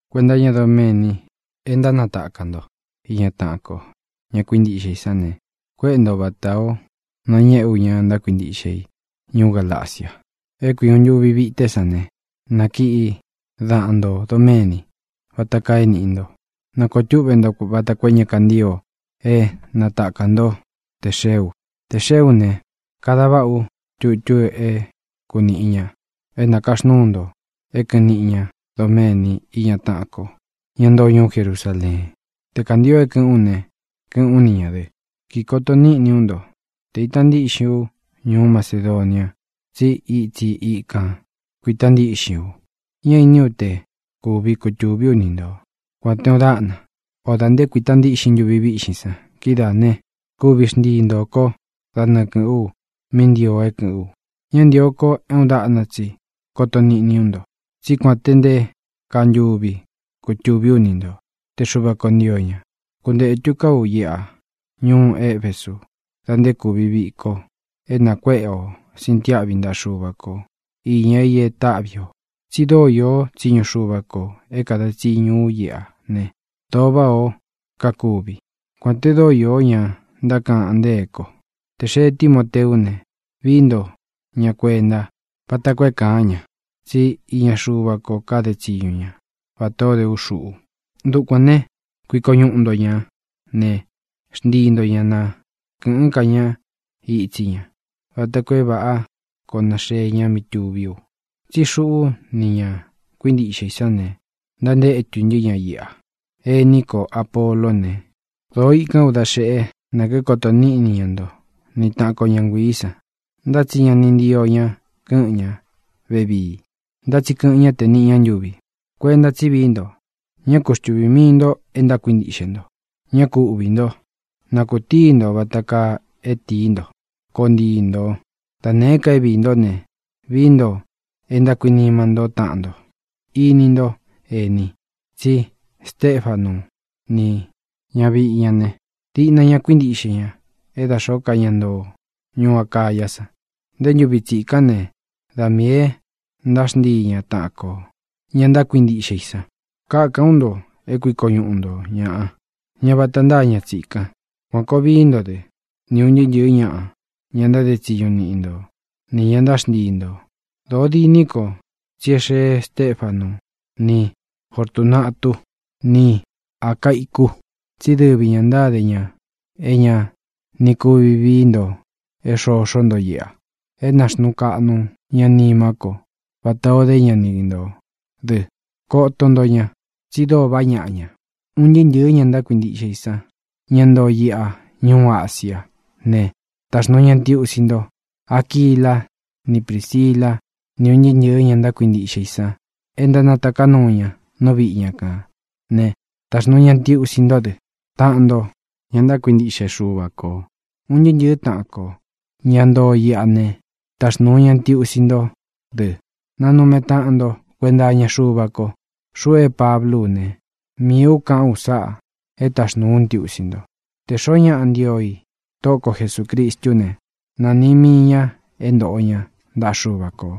Kuenta iñá doméni é ntánatakā nto iña taꞌan ko, ña kuintiꞌxe i sán ne, kuéꞌe nto vata ō nañéꞌe u ña ntákuintiꞌxe i ñuú Galacia. É kui uun ntūvi vité san ne, nakiꞌi daꞌan ntō doméni, vata kaa e níꞌi nto. Na kōo túꞌvē nto vata koo é ña kantío é natakā ntó tē xee u. Tē xeé u ne, kada váꞌa u tutu é kunīꞌi ña é nakaxnúu nto é kɨ̄ꞌɨn niꞌi ñá doméni íña taꞌan ko, ñá ntoo ñuú Jerusaleen. Te kāntio é kɨ̄ꞌɨ́n u ne, kɨ́ꞌɨ̄n ú ni ñā dɨ. Kikoto níꞌni ú nto te īta ntíꞌxin ú ñuú Macedonia, tsí itsi ikān kuita ntíꞌxin u. Ñá iní u te kuvi kutūví u ni nto, kuān te uun dáꞌna, o dā nté kuita ntíꞌxin ntuvi víꞌxin san. Kidáā né, kuvi xntii ntō ko dá nɨɨ kɨ̄ꞌɨ́n u mí ntio é kɨ̄ꞌɨ́n u. Ña ntio ko é uun daꞌna tsi koto niꞌni ú nto, tsí kuān te nté kaa ntuvi kutuví u ni nto, te Xuva kō ntio ña. Kuntētu ka ú iꞌa ñuú Efesu da nté kūvi viko é nakuéꞌe o sintiáꞌvi ntaꞌa Xuva ko īña i é taꞌvi ō, tsí dóo īó tsiñu Xuva kō é kāda tsiñu ú iꞌa ne, dōo váꞌā ó kakuvi, kuān te dóo iō ñá ntákaꞌan ntée ko. Tē xee Tímoteú ne, vií nto ña kuenta vata koo é kāán ña, tsí iña Xuva ko káde tsiñu ña vatā ó de ú xuꞌu. Dukuān né, kuiko ñuꞌu nto ñā ne, xntii nto ña na kɨ̄ꞌɨ́n ka ña itsi ña vata koo é vāꞌá koo naxee ña mí tuví u. Tsí xuꞌú nī ña kuintiꞌxe i sán ne, ntántétu ntɨ́ ña iꞌa. Ení ko Āpoló ne, dōo ikán u da xeꞌe nā kíkoto níꞌni ña nto ni tāꞌán ko ña nguiī san, ntá tsi ña ni ntio ña kɨ́ꞌɨ̄n ñá vevii. Ntá tsi kɨꞌɨn ñá tē niꞌi ña ntuvi. Kuenta tsí vií nto; ñá ku xtuvī mii nto é ntákuintiꞌxe nto. Ñá ku uꞌvī ntó; na kūtíi nto vata kaa é tīí nto. Koo ntii ntō. Da nēé ka é viī ntó ne, vií nto é ntákuinima ntó taꞌan nto. Ini ntó, ēni, tsí Stefanu ni ñavíꞌi ña ne, diꞌna ña kuíntiꞌxe ña é da xōó ka ña ntoo ñuú Acayá san. Nté ntūvi tsikán ne, da miī é ntáxntii ña taꞌan kō, ña ntákuintiꞌxe i san. Kakan ú nto é kuiko ñuꞌu nto ñāꞌa, ña vata ntáa ña tsikan. Kuān koo vií nto dɨ́, ni ūn ntɨɨ́ ntɨ̄ɨ́ ñaꞌa, ña ntáde tsiñu niꞌi nto, nī ña ntáxntii nto. Dōó diní ko tsí é xee Stéfanu ni Fortunátu ni Acáicu, tsí dɨvi ñā ntáde ña é ña ni kuvi vií nto é xoxó nto iꞌa. É nāxnuu kaꞌnu ña nimá ko vatā o dé ña ni ntō dɨ. Koto nto ña, tsi dóo vaꞌá ñaꞌa ña. Un ntɨɨ́ ntɨ̄ɨ́ ña ntákuintiꞌxe i san, ña ntoo iꞌa ñuú Asia ne, taxnuu ña ntiusi nto. Aquila ni Prísila ni un ntɨɨ́ ntɨ̄ɨ ña ntákuintiꞌxe i san e ntánataká nuu ña nú viꞌi ña kān né, taxnūu ña ntiusi ntó dɨ, taꞌan nto, ña ntákuintiꞌxe Xuva kō. Un ntɨɨ́ ntɨ̄ɨ́ taꞌan kō, ña ntoo iꞌa ne, taxnūu ña ntiusi ntó dɨ. Nanume taꞌan nto kuenta iña Xuva ko. Xuꞌu é Pablú u ne, miī u kaꞌu u sáꞌā é taxnūu ú ntiusi nto. Tē xoó ña ntío i Tóꞌo ko Jesūcristú ne, na nīꞌi mii ña é ntoꞌo ña ntaꞌa Xuva kō.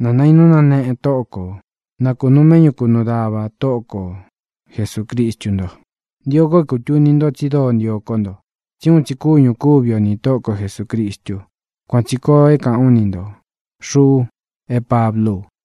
¡Nā nainú náneꞌe Tóꞌo kō! Na kunūu méꞌñu kunuu dava Tóꞌo ko Jesūcristu nto. Ntio ko é kūtuni nto tsi dóo ntio kó nto, tsí uun tsi kúñū kúvi o nī Tóꞌo ko Jesūcristu. Kuan tsī koo é kāꞌán u ni ntō, xuꞌu é Pablú u.